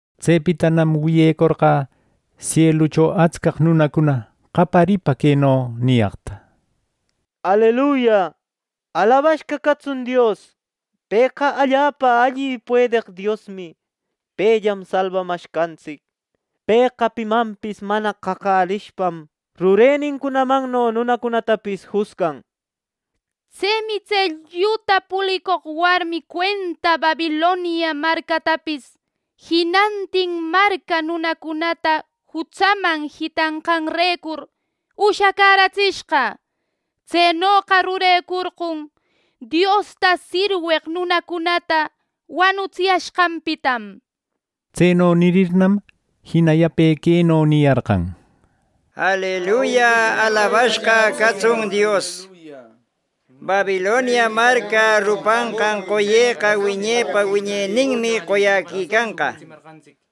Tsepitanam wiyecorqä sielucho atscaq nunacuna qaparipa queno niyaqta: “¡Aleluya! ¡Alabashqa catsun Dios! Pëqa allapa alli y puedeq Diosmi. Pellam salbamashqantsic. Pëqa pimanpis mana qaqärishpam, rurenincunamanno nunacunatapis jusgan. Tsemi tse lluta pulicoq warmi cuenta Babilonia marcatapis jinantin marca nunacunata jutsaman jitanqanrecur, ushacäratsishqa. Tsenoqa rurecurqon, Diosta sirweq nunacunata wanutsiyashqanpitam” nir. Tseno nirirnam jina yape queno niyarqan: “¡Aleluya! ¡Alabashqa catsun Dios! Babilonia marca rupanqan qoye wiñepa wiñeninmi qoyäquicanqa” nir.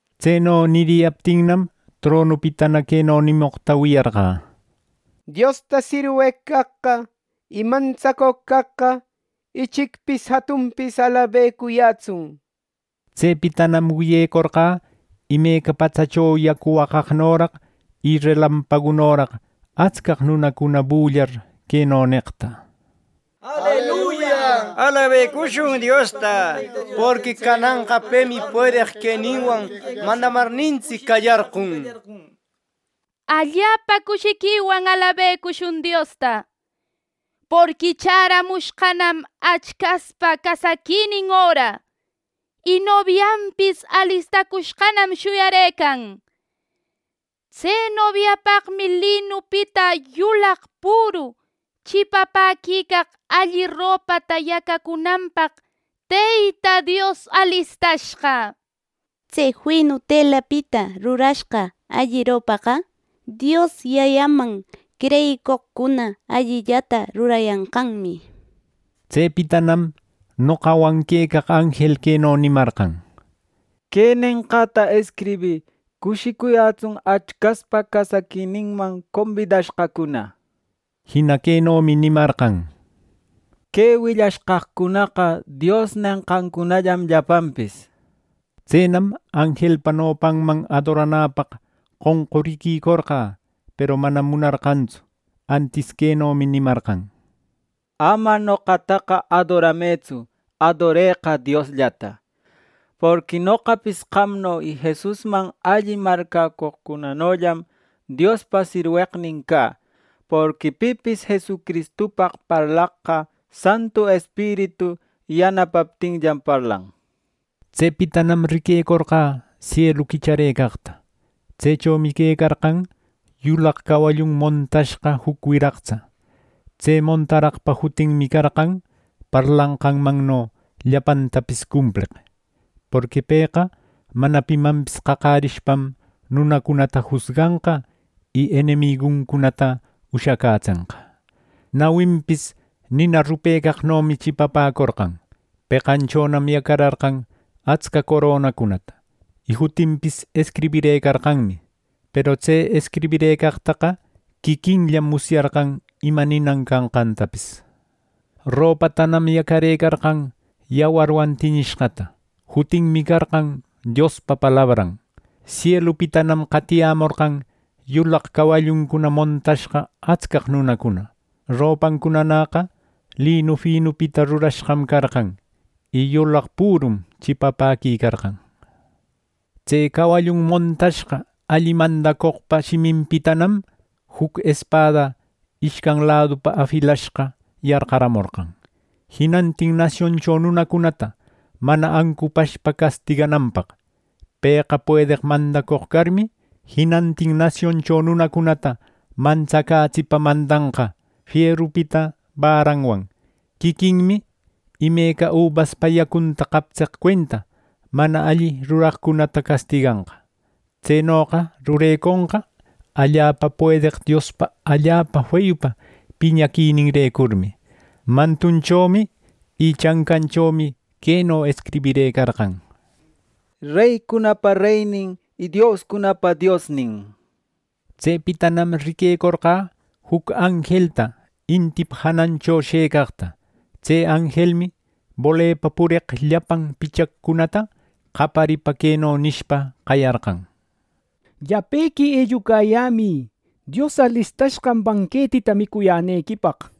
Tseno niriyaptinnam, tronupitana queno nimoqta wiyarqä: “Diosta sirweq caqqa y mantsacoq caqqa, ichicpis jatunpis alabecuyätsun” nishpa. Tsepitanam wiyecorqä imeca paqtsacho yacu waqaqnoraq y relampagunoraq atscaq nunacuna bullar queno neqta: “¡Aleluya! ¡Alabecushun Diosta! Porqui cananqa pemi puedeq queninwan mandamarnintsic qallarcun. ¡Allapa cushiquiwan alabecushun Diosta! Porqui chäramushqanam Achcaspa casaquinin öra; y nobianpis alistacushqanam shuyarëcan. Tse nobiapaqmi linupita yulaq püru chipapäquicaq alli ropata yacacunanpaq Teyta Dios alistashqa. Tse finu telapita rurashga alli ropaqa Dios Yayaman creyicoqcuna allillata rurayanqanmi.” Tsepitanam noqawan quecaq anjel queno nimarqan: “Que nenqäta escribï: ‘Cushicuyätsun Achcaspa casaquininman combidashqacuna’” nir. Jina quenomi nimarqan: “Que willashqaqcunaqa Dios nenqancunallam llapanpis” nir. Tsenam anjelpa nopanman adoranäpaq qonquriquicorqä; peru manam munarqantsu. Antis quenomi nimarqan: “Ama noqataqa adoramëtsu; adoreqa Diosllata, porqui noqapis qamno y Jesusman alli marcäcoqcunanollam Diospa sirweqnin cä. Porqui pipis Jesucristupaq parlaqqa Santu Espiritu yanapaptinllam parlan” nir. Tsepitanam riquecorqä sielu quicharëcaqta. Tsechomi quecarqan yulaq cawallun montashqa juc wiraqtsa. Tse montaraqpa jutinmi carqan “Parlanqanmanno llapantapis Cumpleq”, porqui pëqa mana pimanpis qaqärishpam nunacunata jusganqa, y enemiguncunata ushacätsenqa. Nawinpis nina rupecaqnomi chipapäcorqan, peqanchonam yacararqan atsca coronacunata y jutinpis escribirëcarqanmi; peru tse escribirëcaqtaqa quiquinllam musyarqan ima ninan canqantapis. Ropatanam yacarëcarqan yawarwan tiñishqata. Jutinmi carqan “Diospa Palabran”. Sielupitam qatiyämorqan yulaq cawalluncuna montashqa atscaq nunacuna. Ropancunanäqa linu finupita rurashqam carqan, y yulaq pürum chipapäquicarqan. Tse cawallun montashqa alli mandacoqpa shiminpitanam juc espada ishcan ladupa afilashqa yarqamorqan, jinantin nasioncho nunacunata mana ancupashpa castigananpaq. Pëqa puedeq mandacoq carmi, jinantin nasioncho nunacunata mantsacätsipa mandanqa fierupita barranwan. Quiquinmi imeca ubaspa yacunta qaptseq cuenta mana alli ruraqcunata castiganqa. Tsenoqa rureconqa allapa puedeq Diospa allapa feyupa piñaquininrecurmi. Mantunchomi y chancanchomi queno escribirëcarqan: “REYCUNAPA REYNIN Y DIOSCUNAPA DIOSNIN” nishpa. Tsepitanam riquecorqä juc anjelta intipa janancho shëcaqta. Tse anjelmi bolepa pureq llapan pichaqcunata qaparipa queno nishpa qayarqan: “Llapequi ellucayämï, Dios alistashqan banquetita micuyänequipaq.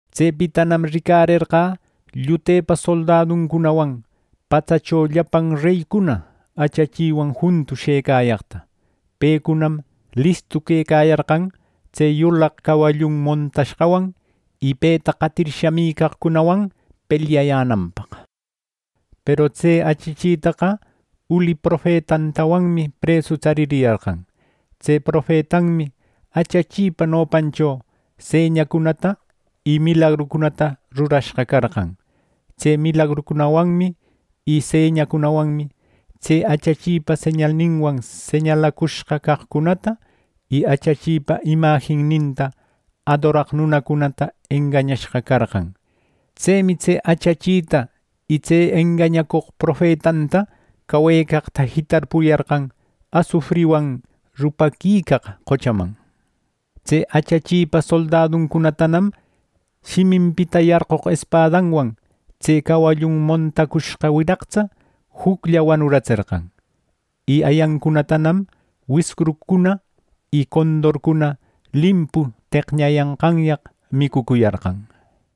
Tsepitanam ricarerqä llutepa soldaduncunawan patsacho llapan reycuna achachiwan juntu shëcayaqta. Pecunam listu quecayarqan tse yulaq cawallun montashqawan, y peta qatir shamicaqcunawan pelyayänanpaq. Peru tse achachitaqa uli profetantawanmi presu tsaririyarqan. Tse profetanmi achachipa nopancho señacunata y milagrucunata rurashqa carqan. Tse milagrucunawanmi y señacunawanmi tse achachipa señalninwan señalacushqa caqcunata, y achachipa imajinninta adoraq nunacunata engañashqa carqan. Tsemi tse achachita y tse engañacoq profetanta cawecaqta jitarpuyarqan asufriwan rupaquicaq qochaman. Tse achachipa soldaduncunatanam shiminpita yarqoq espadawan, tse cawallun montacushqa wiraqtsaqa juclla wanuratserqan y ayancunatanam wiscurcuna y condorcuna limpu teqñayanqanyaq micucuyarqan.